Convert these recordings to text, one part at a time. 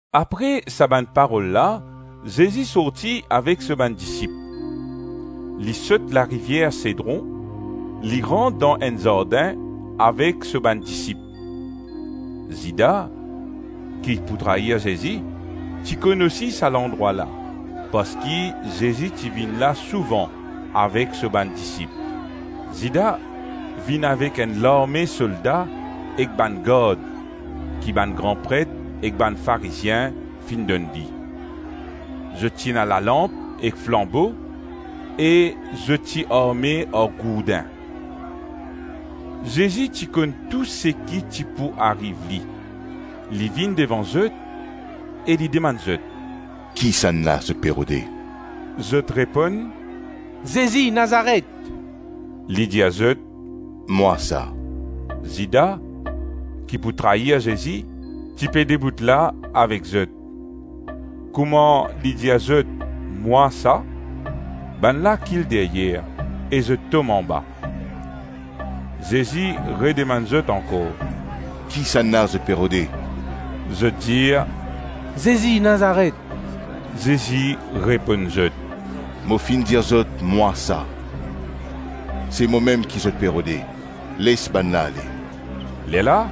Apre sa bann parol la, Zezi sorti avek so bann disip. Li sot larivier Sedron, li rant dan enn zardin avek so bann disip. Zida, ki pou trayir Zezi, ti konn osi sa landrwa la parski Zezi ti vinn la souvan avek so bann disip. Zida vinn avek enn larme solda ek bann gard ki bann gran pret ek bann Farizien finn donn li; zot ti ena lalanp ek flanbo e zot ti arme ar gourdin. Zezi ti konn tou seki ti pou ariv li; li vinn devan zot e li demann zot, “Kisannla zot pe rode?” Zot reponn, “Zezi Nazaret.” Li dir zot, “Mwa sa.” Zida, ki pou trayir Zezi, ti pe debout la avek zot. Kouma li dir zot, “Mwa sa”, bannla kil deryer e zot tom anba. Zezi redemann zot ankor, “Kisannla zot pe rode?” Zot dir, “Zezi Nazaret.” Zezi reponn zot, “Mo finn dir zot, mwa sa; si momem ki zot pe rode, les bannla, ale.” Lerla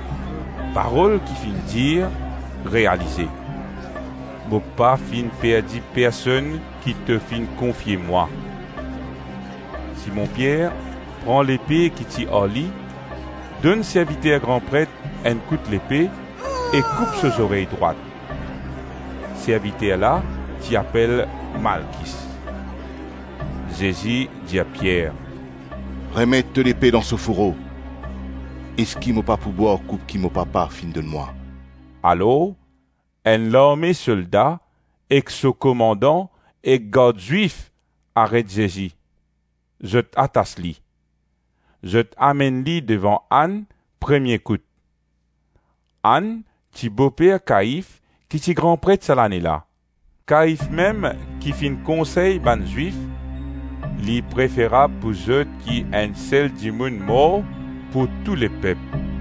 Parol ki finn dir realize, “Mo pa finn perdi personn ki to finn konfie mwa.” Simon Pier pran lepe ki ti ar li, donn serviter gran pret enn kout lepe e koup so zorey drwat. Serviter la ti apel Malkis. Zezi dir Pier, “Remet to lepe dan so fouro; eski mo pa pou bwar koup ki mo Papa finn donn mwa?” Alors enn larme solda ek so komandan ek gard Zwif aret Zezi. Zot atas li. Zot amenn li devan Ann premie kout. Ann ti bo-per Kaif ki ti gran pret sa lane la. Kaif mem ki finn konsey bann Zwif, “Li preferab pou zot ki enn sel dimoun mor pou tou lepep.”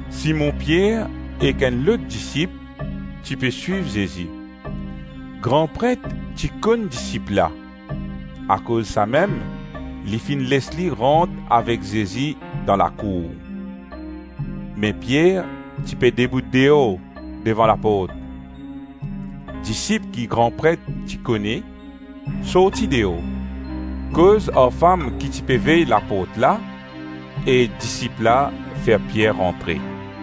Simon Pier ek enn lot disip ti pe swiv Zezi. Gran Pret ti konn disip la, akoz samem li finn les li rant avek Zezi dan lakour. Me Pier ti pe debout deor devan laport. Disip ki gran pret ti kone, sorti deor, koz ar fam ki ti pe vey laport la e disip la fer Pier rantre.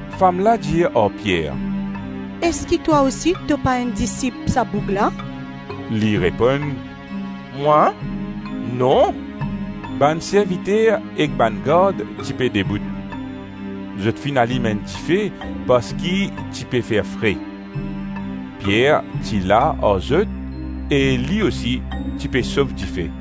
Fam la dir ar Pier, “Eski twa osi to pa enn disip sa boug la?” Li reponn, “Mwa? Non.” Bann serviter ek bann gard ti pe debout. Zot finn alim enn dife parski ti pe fer fre. Pier ti la ar zot e li osi ti pe sof dife.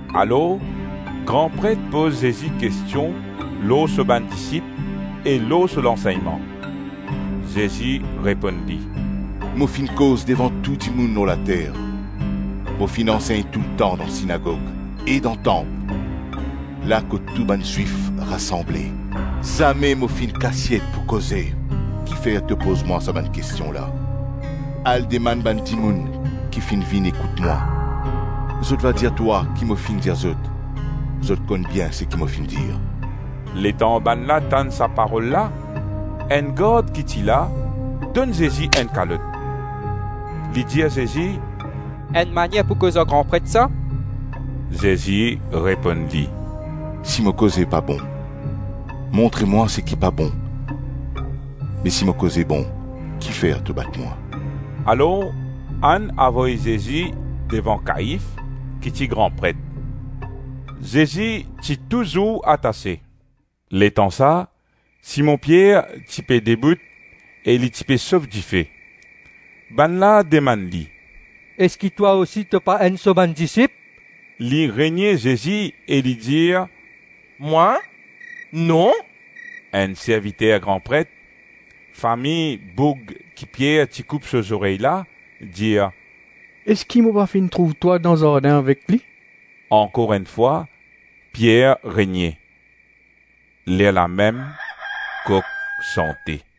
Alors gran pret poz Zezi kestion lor so bann disip e lor so lansegnman. Zezi reponn li, “Mo finn koz devan tou dimoun lor later; mo finn ansegn toultan dan sinagog e dan tanp, la kot tou bann Zwif rasanble; zame mo finn kasiet pou koze. Kifer to poz mwa sa bann kestion la? Al demann bann dimoun ki finn vinn ekout mwa; zot va dir twa ki mo finn dir zot; zot konn bien seki mo finn dir.” Letan bannla tann sa parol la, enn gard ki ti la donn Zezi enn kalot. Li dir Zezi, “Enn manier pou koz ar gran pret sa?” Zezi reponn li, “Si mo koze pa bon, montre mwa seki pa bon me si mo koze bon, ki fer to bat mwa?” Alors Ann avoy Zezi devan Kaif ki ti gran pret. Zezi ti touzour atase. Letan sa, Simon Pier ti pe debout e li ti pe sof dife. Bannla demann li, “Eski twa osi to pa enn so bann disip?” Li renie Zezi e li dir, “Mwa? Non.” Enn serviter gran pret, fami boug ki Pier ti koup so zorey la, dir, “Eski mo pa finn trouv twa dan zardin avek li?” Ankor enn fwa, Pier renie. Lerla mem kok sante.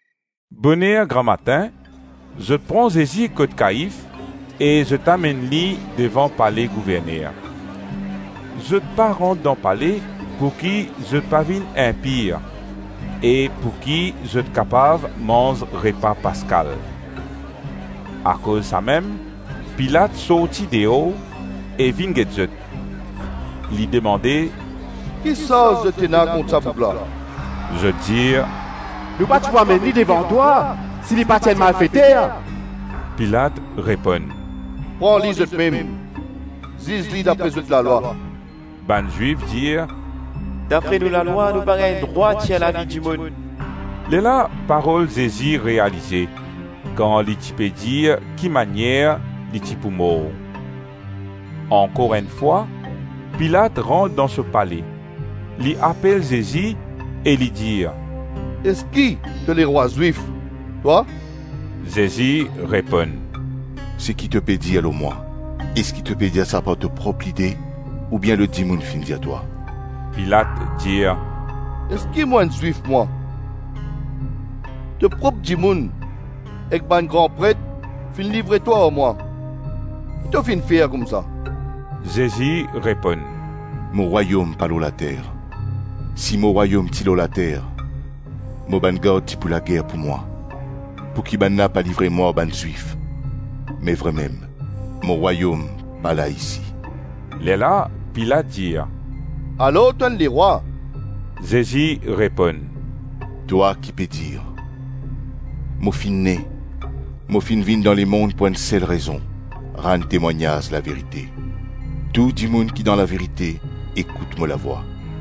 Boner gramatin, zot pran Zezi kot Kaif e zot amenn li devan pale gouverner. Zot pa rant dan pale pouki zot pa vinn inpir e pouki zot kapav manz repa Paskal. Akoz samem Pilat sorti deor e vinn get zot. Li demande, “Ki sarz zot ena kont sa boug la?” Zot dir, “Nou pa ti pou amenn li devan twa, si li pa ti enn malfeter.” Pilat reponn, “Pran li zotmem, ziz li dapre zot lalwa.” Bann Zwif dir, “Dapre nou lalwa nou pa gagn drwat tir lavi dimoun.” Lerla parol Zezi realize kan li ti pe dir ki manier li ti pou mor. Ankor enn fwa, Pilat rant dan so pale, li apel Zezi e li dir, “Eski to lerwa Zwif, twa?” Zezi reponn, “Seki to pe dir lor mwa, eski to pe dir sa par to prop lide ou bien lot dimoun finn dir twa?” Pilat dir, “Eski mo enn Zwif mwa? To prop dimoun ek bann gran pret finn livre twa ar mwa; ki to finn fer koumsa?” Zezi reponn, “Mo Rwayom pa lor later; si mo Rwayom ti lor later, mo bann gard ti pou lager pou mwa, pouki bannla pa livre mwa ar bann Zwif. Me vremem, mo Rwayom pa la isi.” Lerla Pilat dir, “Alors to enn lerwa?” Zezi reponn, “Twa ki pe dir. Mo finn ne, mo finn vinn dan lemonn pou enn sel rezon: rann temwagnaz laverite. Tou dimoun ki dan laverite, ekout mo lavwa.”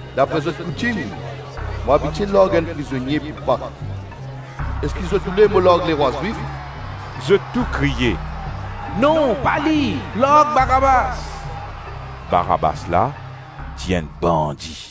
Dapre zot koutim, mo abitie larg enn prizonie pou Pak; eski zot oule mo larg lerwa Zwif?” Zot tou kriye, “Non, pa li! Larg Barabas.” Barabas la ti enn bandi.